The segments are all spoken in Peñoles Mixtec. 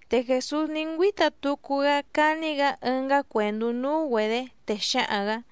Te Jèsús ní ngüíta tucu‑gá cání‑gǎ ɨngá cuèndú núú‑güedě, te xǎhaⁿ‑gǎ: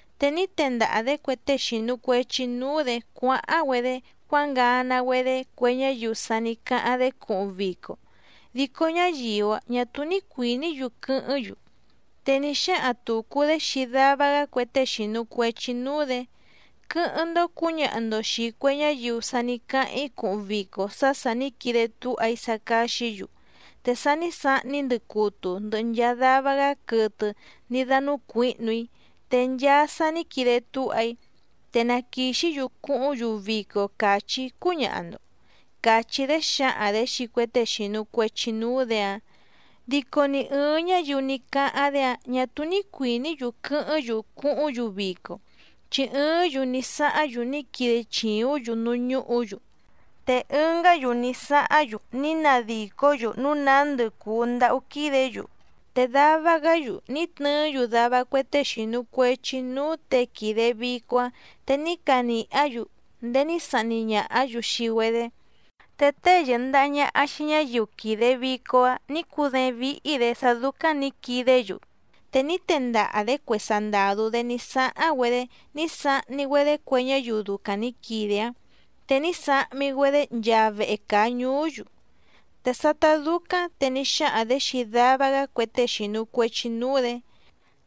Te ní tendaha‑dě cue tée xìnu cuechi núú‑dě cuáháⁿ‑güedé cuángana‑güedé cue ñáyiu sa ní cáháⁿ‑dé cuhuⁿ vico, dico ñáyiu‑áⁿ ñà túú ní cuìní‑yu quɨ́hɨ́ⁿ‑yu. Te ní xáhaⁿ tùcu‑dé xii dava‑gá cue tée xìnu cuechi núú‑dě: “Quɨ́hɨ́ⁿ‑ndó cǔñaha‑ndo xìi cue ñáyiu sa ní cáháⁿ‑í cuhuⁿ vico sá sà ní quide túha‑í sá cáxǐ‑yu, te sa ní sahni‑í ndɨcutu ndɨhɨ nchaa dava‑gá quɨtɨ ní dánúcuǐhnu‑í, te nchaa sa ní quide túha‑í, te na quìxí‑yu cuhúⁿ‑yu vico càchí‑í cúñaha‑ndo”, càchí‑dé xǎhaⁿ‑dě xii cue tée xìnu cuechi núú‑dě‑áⁿ. Dico ni ɨ̀ɨⁿ ñáyiu ní cáháⁿ‑dé‑áⁿ ñà túú ní cuìní‑yu quɨ́hɨ́ⁿ‑yu cuhúⁿ‑yu vico. Chi ɨɨ́ⁿ‑yu ní sáháⁿ‑yu ní quide chìúⁿ‑yu núú ñúhǔ‑yu, te ɨngá‑yu ní sáháⁿ‑yu ní nadìcó‑yu núu nándɨ cùu ndáhú quídě‑yu. Te dava‑gá‑yu ní tnɨɨ́‑yu dava cue tée xìnu cuechi núú těe quìde vico‑áⁿ, te ní canìhá‑yu ndéé ní sahni ñàhá‑yu xii‑güedé. Te tée yɨ̀ndaha ñaha xii ñáyiu quìde vico‑áⁿ nǐ cudééⁿ víhí‑dě sá dúcáⁿ nǐ quidé‑yu, te ní tendaha‑dě cue sandàdú‑dé ní sáháⁿ‑güedé ní sahni‑güedé cue ñáyiu ducaⁿ nǐ quide‑áⁿ, te ní sahmi‑güedé nchaa vehe càa ñuú‑yu. Te sátá dúcáⁿ te ní xáhaⁿ‑dě xii dava‑gá cue tée xìnu cuechi núú‑dě: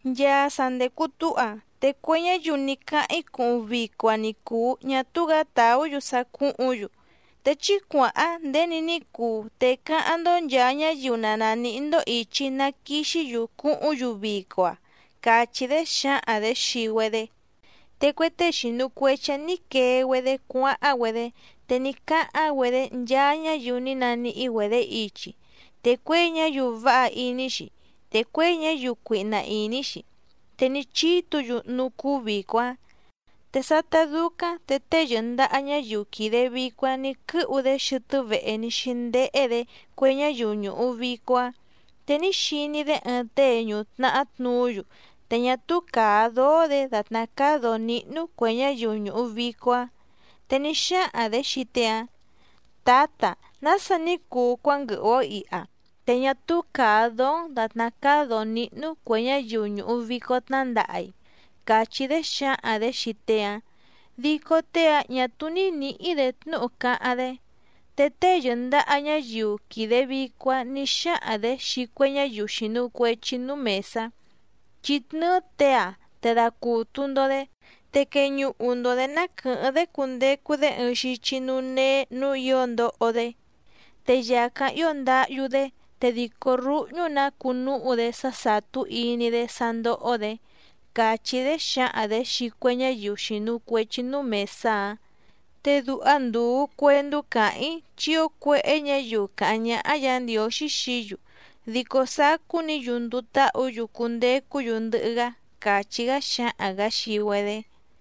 “Nchaa sa ndècu túha, te cue ñáyiu ní cáháⁿ‑í cuhuⁿ vico‑a ni cùu ñá túú‑gǎ tàú‑yu sá cúhǔⁿ‑yu. Te chí cuàháⁿ nděni ní cuu te cáháⁿ‑ndó nchàa ñáyiu na nàníhí‑ndó ìchi na quixí‑yu cuhúⁿ‑yu vico‑a”, càchí‑dé xǎhaⁿ‑dě xii‑güedé. Te cue tée xìnu cuechi‑áⁿ nǐ quee‑güedé cuáháⁿ‑güedé, te ní cáháⁿ‑güedé nchaa ñáyiu ní naníhí‑güedě ichi, te cuěi ñáyiu váha iní‑xi, te cuěi ñáyiu cuihna ìní‑xi, te ní chítǔ‑yu núú cúú vìco‑áⁿ. ’Te sátá dúcáⁿ te tée yɨ̀ndaha ñáyiu quìde vico‑áⁿ nǐ quɨ́hu‑dé xɨtɨ́ vehe ní xíndéhé‑dě cue ñáyiu ñùhu vico‑áⁿ, te ní xiní‑dé ɨɨⁿ tée ñùtnahá tnuú‑yu te ñá túú càa dóó‑dě dàtná cáá dǒó níhnú cuè ñáyiu ñùhu vico‑áⁿ. Te ní xáhaⁿ‑dě xii tée‑áⁿ: “¿Tǎta, nása ní cuu cuánguɨhu‑ǒ iha, te ñá túú càa dóó‑n dàtná cáá dǒó níhnú cuè ñáyiu ñùhu vico tnándaha‑i?”, càchí‑dé xǎhaⁿ‑dě xii tée‑áⁿ. Dico tée‑áⁿ ñà túú ní nǐhí‑dě tnúhu cáháⁿ‑dé. Te tée yɨ̀ndaha ñáyiu quìde vico‑áⁿ nǐ xáhaⁿ‑dě xii cue ñáyiu xìnu cuechi núú mèsá: “Chí tnɨ́ɨ́ těe‑áⁿ te dacùtu‑ndo‑dé, te queñuhu‑ndo‑dě ná quɨ̀hɨ́ⁿ‑dé cundecu‑dé ɨɨⁿ xichi núú néé nǔú ǐo ndoho‑dé, te yàcáⁿ ío ndáhyú‑dé te dìcó rúhñú‑nǎ cuu núhu‑dé sá sàtú iní‑dé sá ndóhó‑dě”, càchí‑dé xǎhaⁿ‑dě xii cue ñáyiu xìnu cuechi núú mèsá‑áⁿ. Te duha ndùu cuendú càháⁿ‑í chi ío cuéhé ñǎyiu càháⁿ ñáhá Yǎ Ndiǒxí xií‑yu, dico sacú‑ni‑yu nduu táhǔ‑yu cundecú‑yu ndɨhɨ‑gá —càchí‑gá xǎhaⁿ‑gǎ xii‑güedé.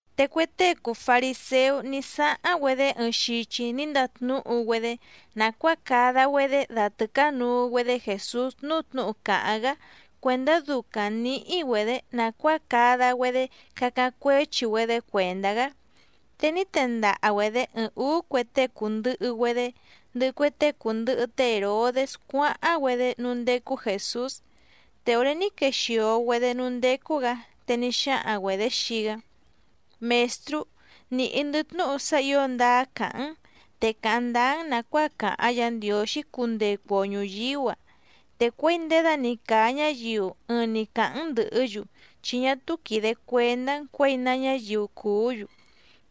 Te cue tée cùu fariséú ní sáháⁿ‑güedé ɨɨⁿ xichi ní ndatnúhu‑güedé nàcuáa cada‑güedé datɨ̀cánuu‑güedé Jèsús núú tnǔhu càháⁿ‑gá cuèndá ducaⁿ nǐhí‑güedě nàcuáa cada‑güedé cacáⁿ cuéchi‑güedé cuèndá‑gá. Te ní tendaha‑güedě ɨɨⁿ ǔú cue tée cùndɨhɨ‑güedé, ndɨhɨ cue tée cùndɨhɨ té Hèrodés cuáháⁿ‑güedé núú ndécú Jèsús. Te òré ní quexìo‑güedé núú ndécú‑gǎ, te ní xáhaⁿ‑güedě xii‑gá: —Mèstrú, nìhí‑ndɨ́ tnúhu sá ǐo ndáá càháⁿ‑n, te càháⁿ ndáá‑n nàcuáa càháⁿ Yǎ Ndiǒxí cundecu‑o ñùyíú‑a, te cuěi nděda‑ni càa ñáyiu ɨɨⁿ‑ni càháⁿ‑n ndɨ̀hɨ́‑yu chi ñá túú quìde cuendá‑n cuěi ná ñáyiu cùú‑yu.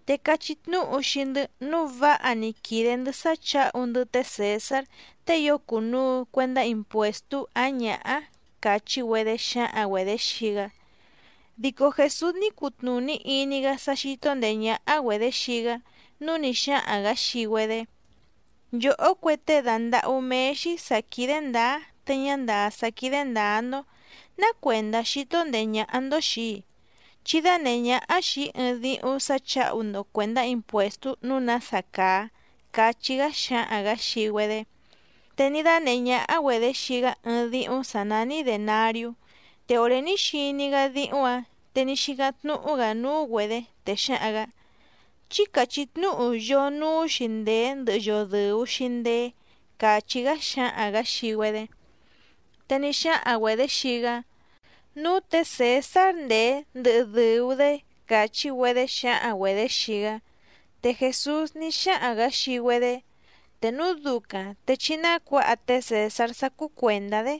Te cachí tnúhu xii‑ndɨ́, núu váha‑ni quìde‑ndɨ́ sá chǎhu‑ndɨ́ té Cèsár tée ío cùnuu cuendá impuèstú áⁿ ñǎhá —càchí‑güedé xǎhaⁿ‑güedě xii‑gá. Dico Jèsús ní cutnùní iní‑gá sá xító ndèé ñáhá‑güedě xii‑gá, núu ní xáhaⁿ‑gǎ xii‑güedé: —Nchòhó cue tée dàndahú méé‑xí sǎ quídé ndǎá te ñá ndàá sá quídé ndǎá‑ndó, ¿ná cuèndá xító ndèé ñáhá‑ndó xìi‑í? Chí dánèhé ñáhá xìi‑í ɨɨⁿ díhúⁿ sǎ chǎhu‑ndo cuèndá impuèstú nǔu nása càa —cachí‑gá xǎhaⁿ‑gǎ xii‑güedé. Te ní dánèhé ñáhá‑güedě xii‑gá ɨɨⁿ díhúⁿ sǎ nání dènariú. Te òré ní xiní‑gá díhúⁿ‑ǎⁿ te ní xícáⁿ tnúhú‑gǎ núú‑güedě, te xǎhaⁿ‑gǎ: —Chí càchí tnúhu yoo núú‑xi ndèé ndɨhɨ yoo dɨ̀u‑xi ndeé —càchí‑gá xǎhaⁿ‑gǎ xii‑güedé. Te ní xáhaⁿ‑güedě xii‑gá: —Núú tě Cèsár ndèé ndɨhɨ dɨ̀u‑dé —càchí‑güedé xǎhaⁿ‑güedě xii‑gá. Te Jèsús ní xáhaⁿ‑gǎ xii‑güedé: —Te núu ducaⁿ te chí nácuǎha té Cèsár sá cúú cuèndá‑dé,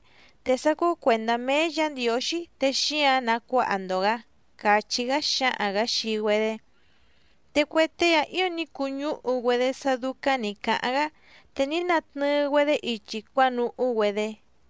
te sá cúú cuèndá méé Yǎ Ndiǒxí te xíǎⁿ nacuáha‑ndo‑gǎ —càchí‑gá xǎhaⁿ‑gǎ xii‑güedé. Te cue tée‑áⁿ ǐo ní cuñúhu‑güedé sá dúcáⁿ nǐ cáháⁿ‑gá, te ní natnɨɨ‑güedé ichi cuánuhú‑güedé.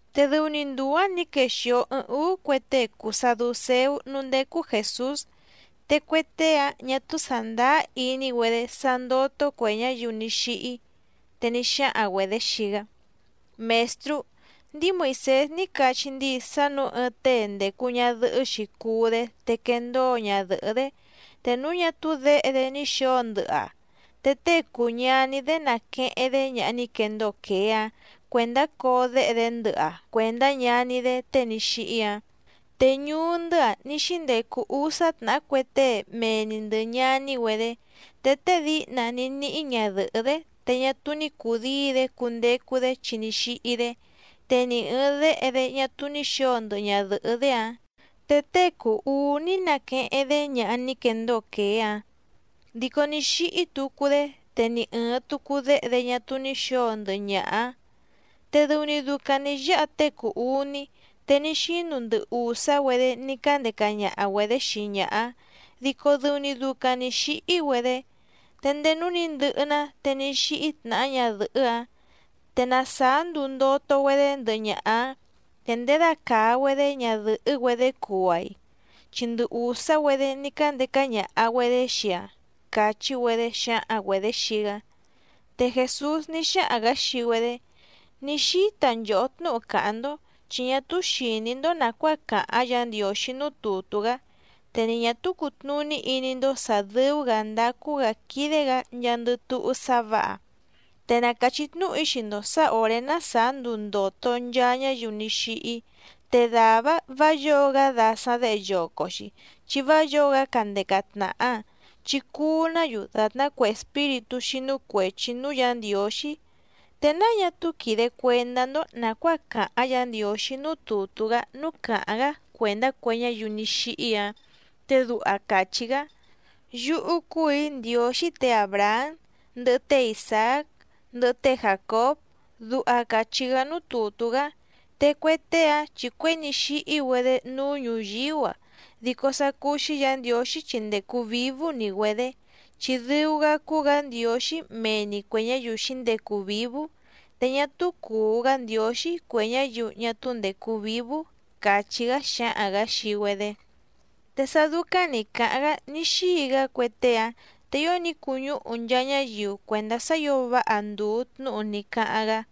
Te dɨu‑ni nduu‑ǎⁿ nǐ quexìo ɨɨⁿ úú cue tée cùu saducéú núú ndécú Jèsús. Te cue tée‑áⁿ ñà túú sàndáá iní‑güedé sá ndótó cuè ñáyiu ní xíhí, te ní xáhaⁿ‑güedě xii‑gá: —Mèstrú, ndíi Moìsés ní cachí ndíi sá nǔu ɨɨⁿ tée ndècu ñadɨhɨ́‑xi cuú‑dé te quendóo ñadɨ̀hɨ́‑dé, te núu ñá túú děhe‑dé ní xǒo ndɨhɨ‑aⁿ te tée cùu ñaní‑dé naqueheⁿ‑dé ñaha ní quendóo quèé‑áⁿ cuèndá coo déhe‑dé ndɨhɨ‑aⁿ cuèndá ñaní‑dé tée ní xíhí‑áⁿ. Te ñuú‑ndɨ́‑a ní xíndecu úsá tnàhá cue tée mee‑ni ndɨ̀ ñaní‑güedé. Te tée díhna ní níhí ñadɨ̀hɨ́‑dé te ñá túú ní cùdíi‑dé cundecu‑dé chi ní xíhí‑dé, te ni ɨ̀ɨⁿ déhe‑dé ñá túú ní xǒo ndɨhɨ ñadɨ̀hɨ́‑dé‑áⁿ. Te tée cùu uú ní nàqueheⁿ‑dé ñaha ní quendóo quèé‑áⁿ. Dico ní xíhí tucu‑dé, te ni ɨ̀ɨⁿ tucu déhe‑dé ñá túú ní xǒo ndɨhɨ ñaha‑áⁿ, te dɨu‑ni ducaⁿ nǐ yáha tée cùu uní, te ní xínu ndɨ ùsá‑güedé ní cándeca ñaha‑güedě xii ñaha‑áⁿ dico dɨu‑ni ducaⁿ nǐ xíhí‑güedé. Te ndéé núú nǐ ndɨhɨ‑ná te ní xíhí tnàhá ñadɨ̀hɨ́‑áⁿ. Te na sàá nduu ndòto‑güedé ndɨhɨ ñaha‑áⁿ, ¿te ndědacàa‑güedé ñadɨ̀hɨ́‑güedé cuu‑aⁿ‑i? Chi ndɨ ùsá‑güedé ní cándeca ñaha‑güedě xii‑aⁿ —càchí‑güedé xǎhaⁿ‑güedě xii‑gá. Te Jèsús ní xáhaⁿ‑gǎ xii‑güedé: —Ní xíta nchòhó tnúhu càháⁿ‑ndó, chi ñá túú xìní‑ndó nàcuáa càháⁿ Yǎ Ndiǒxí núú tùtú‑gá, te ni ñà túú cùtnuní iní‑ndó sǎ dɨ́ú‑gǎ ndácú‑gǎ quídé‑gǎ nchaandɨ túhú sá vǎha. Te na càchí tnúhu‑í xii‑ndo sǎ òré ná sàá nduu ndòto nchaa ñáyiu ní xíhí, te dàvá‑áⁿ vǎ yǒo‑gá dasaⁿ děhe yoco‑xi chi vá yǒo‑gá candeca tnàha, chi cuu‑ná‑yu dàtná cue espíritú xínú cuèchi núú Yǎ Ndiǒxí. ¿Te náa ñá túú quìde cuendá‑ndó nàcuáa càháⁿ Yǎ Ndiǒxí núú tùtú‑gá núú càháⁿ‑gá cuèndá cue ñáyiu ní xíhí‑ǎⁿ? Te duha càchí‑gá: “Yúhú cúù‑í Ndiǒxí tě Àbrahám, ndɨhɨ té Isàác, ndɨhɨ té Jàcób”, duha càchí‑gá núú tùtú‑gá. Te cue tée‑áⁿ chi cuěi ní xíhí‑güedé núú ñùyíú‑a, dico sá cúú‑xí Yǎ Ndiǒxí chi ndècu vívú‑ni‑güedě. Chi dɨu‑gá cúú‑gǎ Ndiǒxí mee‑ni cuè ñáyiu xǐndecu vǐvú, te ñá túú cùu‑gá Ndiǒxí cue ñáyiu ñá túú ndècu vívú —càchí‑gá xǎhaⁿ‑gǎ xii‑güedé. Te sá dúcáⁿ nǐ cáháⁿ‑gá ní xíi‑gá cue tée‑áⁿ, te ío ní cuñúhu nchaa ñáyiu cuèndá sá ǐo váha ndùu tnúhu ní cáháⁿ‑gá.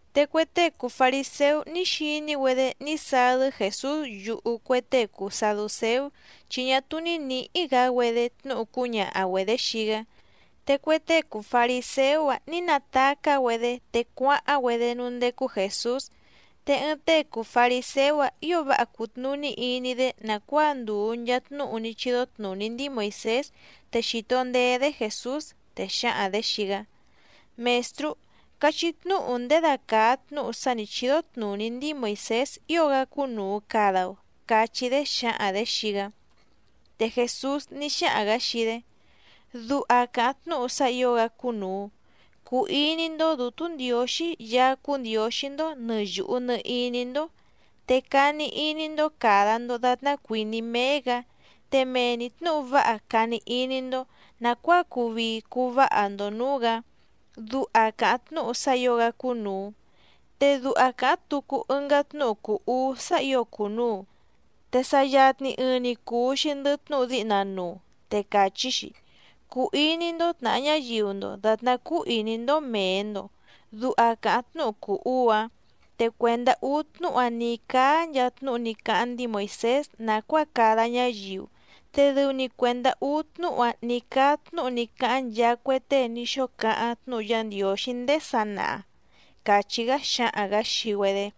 Te cue tée cùu fariséú ní xiní‑güedé ní sadɨ́ Jèsús yuhu cue tée cùu saducéú, chi ñá túú ní nǐhí‑gǎ‑güedé tnúhu cúñaha‑güedě xii‑gá, te cue tée cùu fariséú‑áⁿ nǐ natacá‑güedé te cuáháⁿ‑güedé núú ndécú Jèsús. Te ɨɨⁿ tée cùu fariséú‑áⁿ ǐo váha cùtnuní iní‑dé nàcuáa ndùu nchaa tnúhu ní chídó tnùní ndíi Moìsés te xìto ndeé‑dé Jèsús, te xǎhaⁿ‑dě xii‑gá: —Mèstrú, cachí tnúhu ndědacàa tnúhu sá nǐ chídó tnùní ndíi Moìsés ío‑gá cúnùu cada‑o —cachí‑dé xǎhaⁿ‑dě xii‑gá. Te Jèsús ní xáhaⁿ‑gǎ xii‑dé: —Duha càháⁿ tnúhu sá ǐo‑gá cúnùu: “Cuu iní‑ndó Dǔtú Ndiǒxí Yaá cúú Ndiǒxí‑ndó nɨ̀ yuhu nɨ iní‑ndó, te cani iní‑ndó càda‑ndo datná cuìní méé‑gǎ, te mee‑ni tnǔhu váha cani iní‑ndó nàcuáa cuu vii cuu váha‑ndo nǔú‑gǎ”, duha càháⁿ tnúhu sá ǐo‑gá cúnùu. Te duha càháⁿ tucu ɨngá tnúhu cùu uú sá ǐo cùnuu, te sa yatni ɨɨⁿ‑ni cùu‑xi ndɨhɨ tnúhu díhna nuu, te càchí‑xi: “Cuu iní‑ndó tnàha ñáyiu‑ndo dàtná cúú ìní‑ndó mèe‑ndo”, duha càháⁿ tnúhu cùu uú‑áⁿ. Te cuèndá úú tnúhu‑a ní cáá nchaa tnúhu ní cáháⁿ ndíi Moìsés nàcuáa cada ñáyiu, te dɨu‑ni cuèndá úú tnúhu‑a ní cáá tnúhu ní cáháⁿ nchaa cue tée ní xóo cáháⁿ tnúhu Yá Ndiǒxí ndéé sanaha —càchí‑gá xǎhaⁿ‑gǎ xii‑güedé.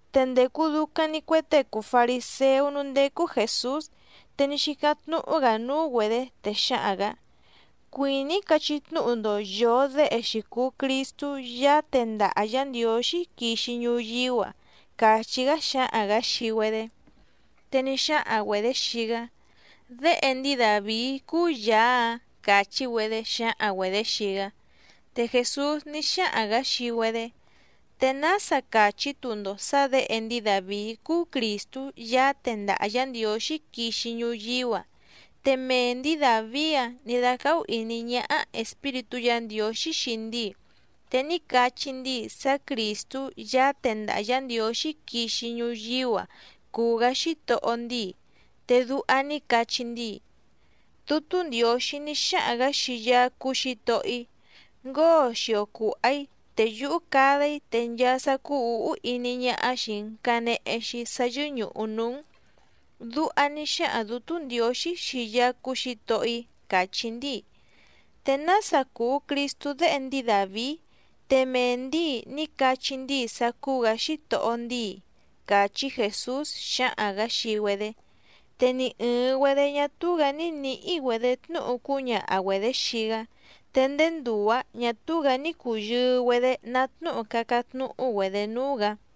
Te ndècu ducaⁿ‑ni cue tée cùu fariséú núú ndécú Jèsús. Te ní xícáⁿ tnúhú‑gǎ núú‑güedě, te xǎhaⁿ‑gǎ: —Cuìní‑í cachí tnúhu‑ndo yòo déhe‑xi cùu Cristú Yaá tendaha Yǎ Ndiǒxí quixi ñuyíú‑a —càchí‑gá xǎhaⁿ‑gǎ xii‑güedé. Te ní xáhaⁿ‑güedě xii‑gá: —Déhe ndíi Dàvií cúú Yàá‑áⁿ —càchí‑güedé xǎhaⁿ‑güedě xii‑gá. Te Jèsús ní xáhaⁿ‑gǎ xii‑güedé: —¿Te nása càchí‑tu‑ndo sǎ děhe ndíi Dàvií cúú Crìstú Yaá tendaha Yǎ Ndiǒxí quixi ñuyíú‑a, te mee ndǐi Dàvií‑áⁿ nǐ dácáhú ìní ñáhá Espíritú Yǎ Ndiǒxí xii ndíi, te ní cachí ndíi sá Crìstú Yaá tendaha Yǎ Ndiǒxí quixi ñuyíú‑a cùu‑gá Xítohó ndíi? Te duha ní cachí ndíi: Dútú Ndiǒxí ní xáhaⁿ‑gǎ xii Yaá cúú Xǐtohó‑í: “Ngóo xio cùha‑í, te yúhú cada‑í te nchaa sá cúú ǔhú iní ñáhá xìi‑n canehe‑xi sá yɨ́ñùhu núú‑n.” Duha ní xáhaⁿ Dǔtú Ndiǒxí xii Yaá cúú Xǐtohó‑í, càchí ndíi. ¿Te nása cùu Cristú déhe ndíi Dàvií, te mee ndǐi ní cachí ndíi sá cúú‑gǎ Xítohó ndíi? —càchí Jèsús xǎhaⁿ‑gǎ xii‑güedé. Te ni ɨ̀ɨⁿ‑güedé ñá túú‑gǎ ní nǐhí‑güedě tnúhu cúñaha‑güedě xii‑gá. Te ndéé nduu‑ǎⁿ ñà túú‑gǎ ní cùyɨɨ‑güedé ná tnúhu cácáⁿ tnúhú‑güedě núú‑gǎ.